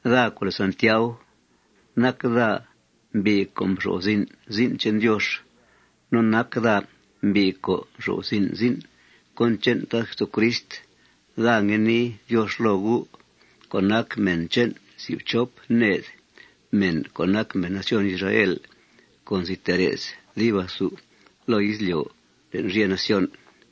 Daa co' lèe Santiau, nac daa mbi' co' nxo'f zin' zin' che'n Diox. No nac daa mbi' co' nxo'f zin' zin' cón che'n Tad Jesucrist. Daa ngue nii Diox loo gu' co' nac mèn che'n si' fchop ned mèn co' nac mèn nación Israel co' nzi tee re's dib athu loo izlyo' le'n rye nación.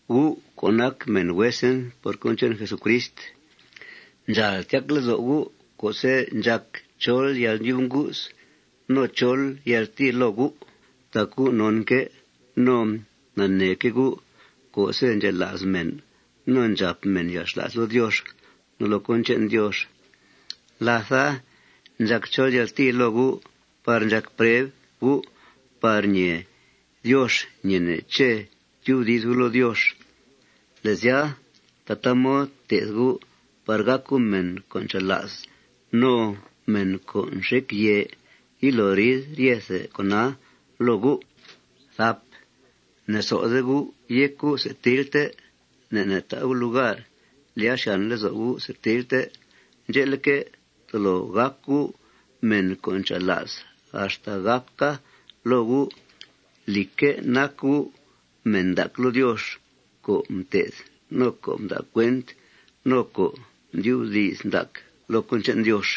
Gu' co' nac mèn huesen por cón che'n Jesucrist, ndxàal tyac lezo' gu' co'se' ndxàc chol yalndyub ngu's no chol yaltìi loo gu'. Tac gu' nonque' no naneeque' gu' co'se' ndxela's mèn no ndxàp mèn yalxla's loo Diox no loo cón che'n Diox, látha ndxàc chol yaltìi loo gu' par ndxàc preb gu' par ñee Diox ñeene' ché' tyubdi's gu' loo Diox. Le' sya, tataa mod té'th gu' par gàc gu' mèn co' ncha'la's no mèn co' nxec yèe yilo riid ryethe con'a loo gu'. Ne'sode gu' yéc gu' setilte. Ne' ne' ta' gu' lugar lyàa xyàn lezo' gu' setilte. Ndxe'leque', tolo gàc gu' mèn co' ncha'la's axta gàca loo gu', lìcque', nac gu' mèn ndac loo Diox co' mté'th, no co' mda' cuent, no co' ndyubdi's ndac loo cón che'n Diox.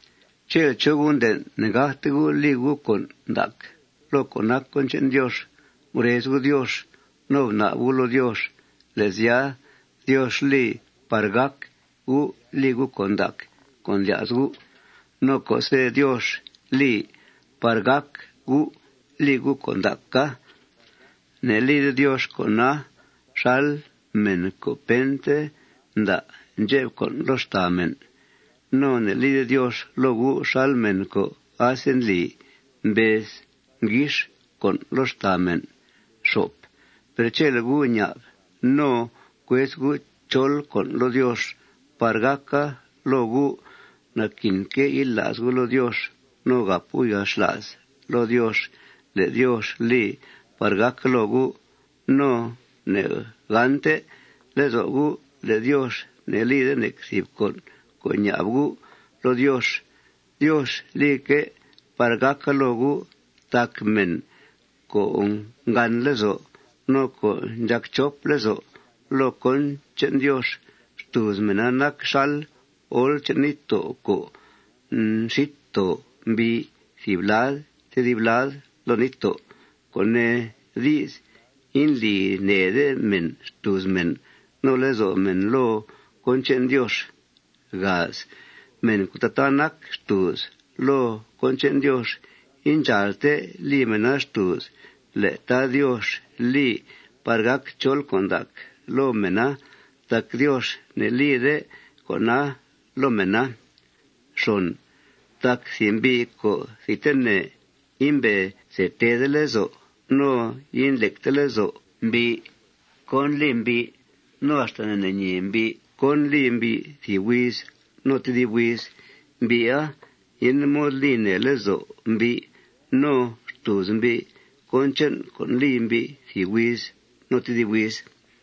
Chele' chó gu' nden' ne'gácte gu' li gu' con' ndac loo co' nac cón che'n Diox, gurez gu' Diox no bna'b gu'i loo Diox. Le' sya, Diox li par gác gu' li gu' con' ndac co' ndlya's gu'. No co'se' Diox li par gác gu' li gu' con' ndaca, ne'lide Diox con'a xal mèn co' pente nda' ndxep con' loo xtàa mèn. No ne'lide Diox loo gu' xal mèn co' asendli mbez nguix con' loo xtàa mèn. Per chele' gu' ña'b no cuez gu' chol con' loo Diox par gàca loo gu', naquinque' yila's gu' loo Diox no gàp gu' yalxla's loo Diox le' Diox li par gàca loo gu'. No ne'gànte lezo' gu' le' Diox ne'lide nec thìb con' co' ña'b gu' loo Diox. Diox lique' par gàca loo gu'. Tac mèn co' ngàn lezo' no co' ndxàc chop lezo' loo cón che'n Diox, xtùuz mèna nac xal ol che'n níttó' co' nxít too mbii thìb lad tedib lad loo níttó', co' nee di's, indli nèede mèn xtùuz mèn no lezo' mèn loo cón che'n Diox. Mèn co' tataa nac xtùuz loo cón che'n Diox, indxàalte li mèna xtùuz le' Tad Diox li par gàc chol con' ndac loo mèna tac Diox ne'lide con'a loo mèna. Tac thìb mbi' co' thidtene imbe see teede lezo' no indlecte lezo' mbi' cón li mbi', no axta ne'ñeede mbi' cón li mbi' thìb huiz no tedib huiz, mbi'a yende mod li nèe lezo' mbi' no xtùuz mbi' cón che'n con' li mbi' thìb huiz no tedib huiz.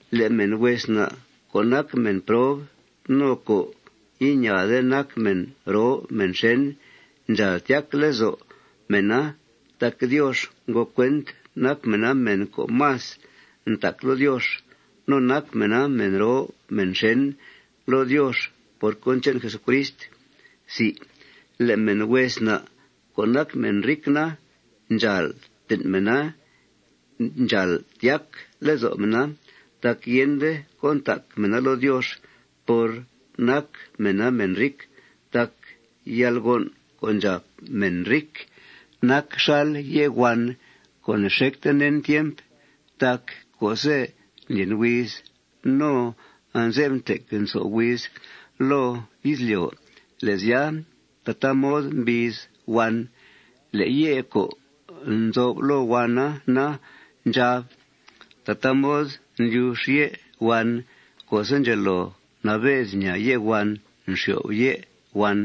Le' mèn hues na' co' nac mèn prob no co' iñaade nac mèn roo mèn xèn, ndxàal tyac lezo' mèna tac Diox ngo cuent nac mèna mèn co' más ntac loo Diox. No nac mèna mèn roo mèn xèn loo Diox por cón che'n Jesucrist. Le' mèn hues na' co' nac mèn ric na, ndxàal ten' mèna ndxàal tyac lezo' mèna tac yende cón ntac mèna loo Diox por nac mèna mèn ric. Tac yalgon' co' ndxàp mèn ric nac xal ye' huan co' ne'xecte nen tiemp. Tac co'se' ndlyen huiz no anze'f ntec nso' huiz loo izlyo', le' sya, tataa mod mbiiz huan. Le' ye' co' nzo'f loo huana na, ndxà'b. Tataa mod ndlyux ye' huan co'se' ndxelo nabe's ñaa ye' huan nxyo'f ye' huan.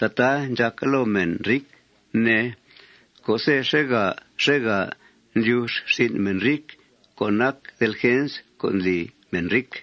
Tataa ndxàca loo mèn ric, ne, co'se' xèegà xèegà ndlyux rsin' mèn ric co' nac delgens co' ndli mèn ric.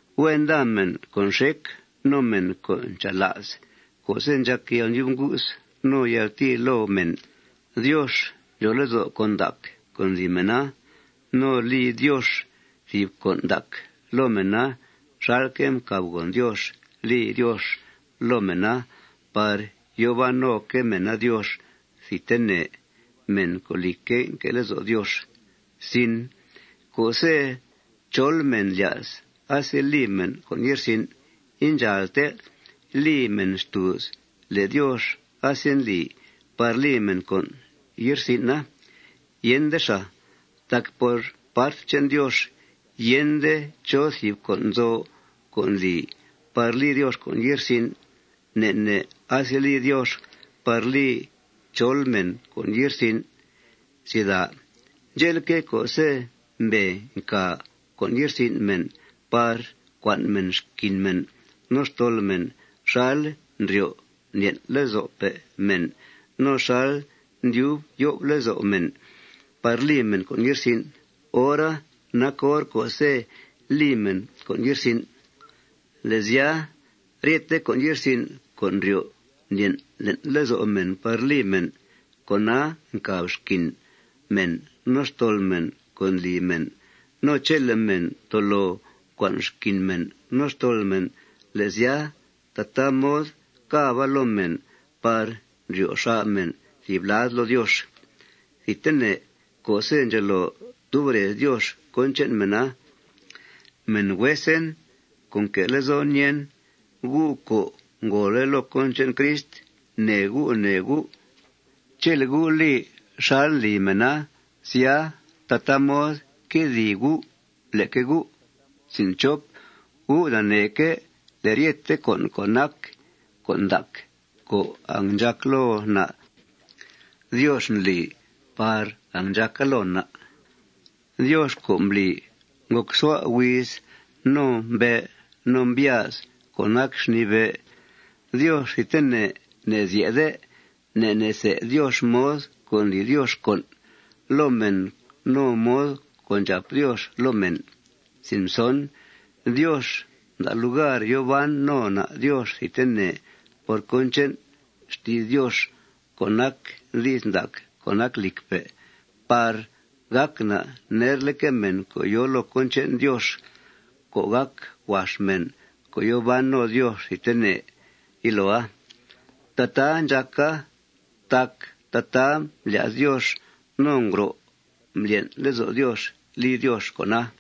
Huen nda mèn co' nxec no mèn co' ncha'la's co'se' ndxàc yalndyub ngu's no yaltìi loo mèn. Diox ndxòo lezo' con' ndac co' ndli mèna. No li Diox thìb con' ndac loo mèna xalque' mcàbgòn Diox li Diox loo mèna par yòo ban noque' mèna Diox thidtene, mèn co', lìcque', nque' lezo' Diox. Co'se' chol mèn lya's aseli mèn con' ye'rsin', indxàalte li mèna xtùuz le' Diox asendli par li mèna con' ye'rsin'a. Yende xàa. Tac por part che'n Diox, yende chó thìb con' nzo co' ndli par li Diox con' ye'rsin'. Ne' ne' aseli Diox par li chol mèn con' ye'rsin'. Ndxe'leque', co'se' mbee ncà con' ye'rsin' mèn par cua'n mèn xquin mèn no xtol mèn xal ndryo' ndlyen' lezo'pe' mèn no xal ndyub yo'f lezo' mèn par li mèn con' ye'rsin', hora nac hor co'se' li mèn con' ye'rsin'. Le' sya, ryete con' ye'rsin' co' ndryo' ndlyen' le'n lezo' mèn par li mèn, con'a ncàb xquin mèn no xtol mèn co' ndli mèn. No chele' mèn tolo cua'n xquin mèn no xtol mèn, le' sya, tataa mod càba loo mèna par ndryo xà' mèn thìb lad loo Diox thidtene co'se' ndxelo tub rez Diox cón che'n mèna. Mèn huesen co' nque' lezon ñèen, gu' co' ngòole' loo cón che'n Crist, nee gu' nee gu'. Chele' gu' li xal ndli mèna, sya, tataa mod quedìi gu' leque gu'. Gu' naneeque' le' ryethe con' co' nac con' ndac co' angndxàc loo na', Diox ndlii par angndxàca loo na'. Diox co' mbli ngòcsua' huiz no mbe' no mbyáz co' nac xnìi bé', Diox thidtene ne'zye'de. Ne' ne' se' Diox mod co' ndli Diox con' loo mèn no mod co' ndxàp Diox loo mèn. Diox mda' lugar yòo ban no na' Diox thidtene por cón che'n xti's Diox co' nac di's ndac co' nac lìcpe' par gàc na' nerleque' mèn co' yòo loo cón che'n Diox, co' gàc huax mèn co' yòo ban no Diox thidtene yiloa. Tataa ndxàca tac tataa mblya's Diox no ngro' mblyen' lezo' Diox li Diox con'a.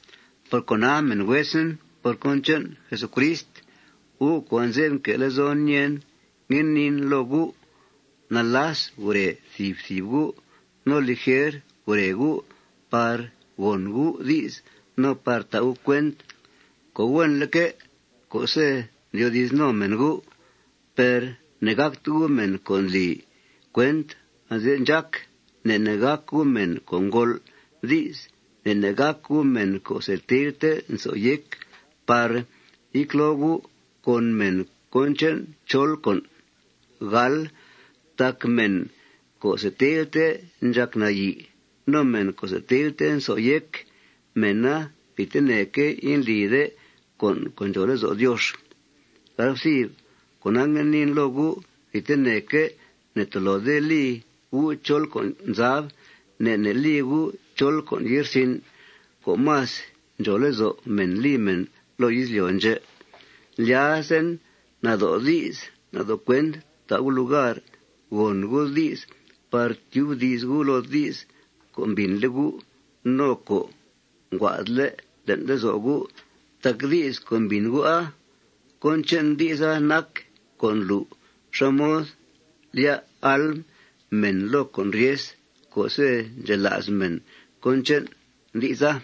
Por cona, mèn huesen por cón che'n Jesucrist, gu' co' anze'f nque' lezon ñèen, ngue niin loo gu': Nalas gure thìb thìb gu'. No lijer gure gu' par gòn gu' di's no par ta' gu' cuent co' huenleque' co'se' ndyoodi's no mèn gu'. Per ne'gàcte gu' mèn co' ndli cuent anze'f ndxác. Ne' ne' gàc gu' mèn co' ngol' di's. Ne' ne' gàc gu' mèn co' setilte nso' yéc par yecloo gu' con mèn cón che'n chol con'. Tac mèn co' setilte ndxàc nayi' no mèn co' setilte nso' yéc, mèna thidtene indlide con' co' ndxòo lezo' Diox. Cona, ngue niin loo gu': Thidteneque' ne'tolode li gu' chol con' zab. Ne' ne' li gu' chol con' ye'rsin' co' más ndxòo lezo' mèn li mèn loo izlyo' ndxè'. Ndlyazen nado' di's nado' cuent ta' gu' lugar gòn gu' di's par tyubdi's gu' loo di's co' mbìnle' gu' no co' nguaa'dle' le'n lezo' gu'. Tac di's co' mbìn gu'a, cón che'n di'sa nac co' ndlu' xá mod ndlyá' alm mèn loo con' ryes co'se' ndxela's mèn cón che'n di'sa.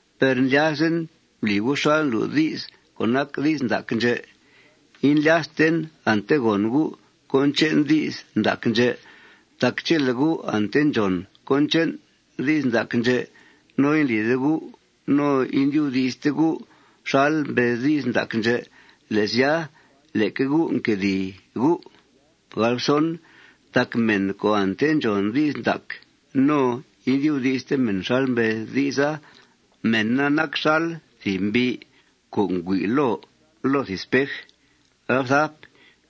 Per ndlyazen bli gu' xal ndlu' dis co' nac di's ndac ndxè'. Indlyasten ante gòn gu' cón che'n di's ndac ndxè'. Tac chele' gu' ante ndxòn cón che'n di's ndac ndxè', no indlide gu' no indyubdi'ste gu' xal mbez di's ndac ndxè', le' sya, leque gu' nquedìi gu'. Tac mèn co' ante ndxòn di's ndac no indyubdi'ste mèna xal mbez di'sa, mèna nac xal thìb mbi' co' ngüi' loo loo thìb spej.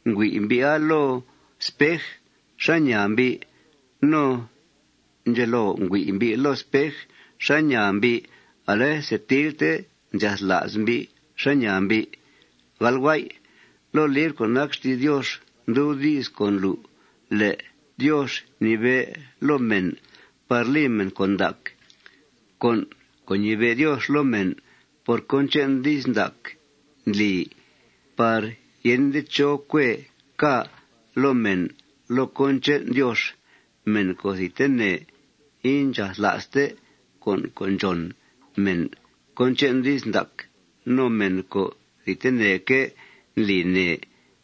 Ngüi' mbi'a loo spej xá ñaa mbi'. No ndxelo ngüi' mbi' loo spej xá ñaa mbi', ale setilte ndxathla's mbi' xá ñaa mbi'. Loo libr co' nac xti's Diox ndub di's co' ndlu' le' Diox mnibe' loo mèn par li mèn con' ndac. Con' co' ñibe' Diox loo mèn por cón che'n di's ndac ndli par yende chó cuee ca' loo mèn loo cón che'n Diox. Mèn co' thidtene indxathla'ste con' co' ndxòn mèn cón che'n di's ndac, no mèn co' thidteneque' ndli nèe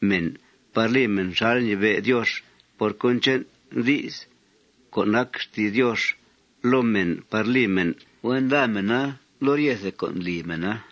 mèn par li mèna xal ñibe' Diox por cón che'n di's co' nac xti's Diox loo mèn par li mèn, huen nda mèna loo ryethe con' ndli mèna.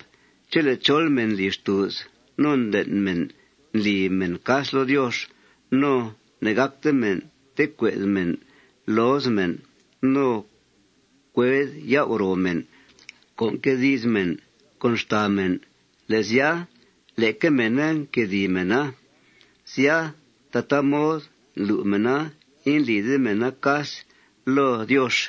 Chele' chol mèn ndli xtùuz no nden' mèn ndli mèn cas loo Diox no ne'gácte mèn tecue'd mèn looz mèn no cued yau' ro mèn co' nque di's mèn con xtàa mèn, le' sya, leque mèna nquedìi mèna. Sya, tataa mod ndlu' mèna indlide mèna cas loo Diox.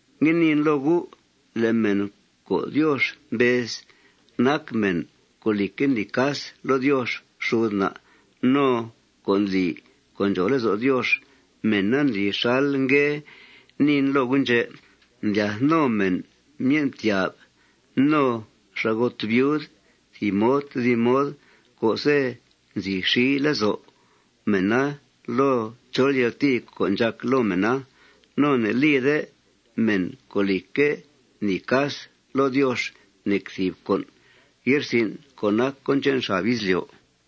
Ngue niin loo gu': Le' mèn co' Diox mbez nac mèn co', lìcque', ndli cas loo Diox xud na' no co' ndli co' ndxòo lezo' Diox, mèna ndli xal ngue niin loo gu' ndxè': Ndlyath no mèn myen' ftyà'f, no xa'got viud, thìb mod tedib mod co'se' nxi lezo' mèna loo chol yaltìi co' ndxàc loo mèna. No ne'lide mèn co', lìcque', ndli cas loo Diox nec thìb con' ye'rsin' co' nac cón che'n xab izlyo'.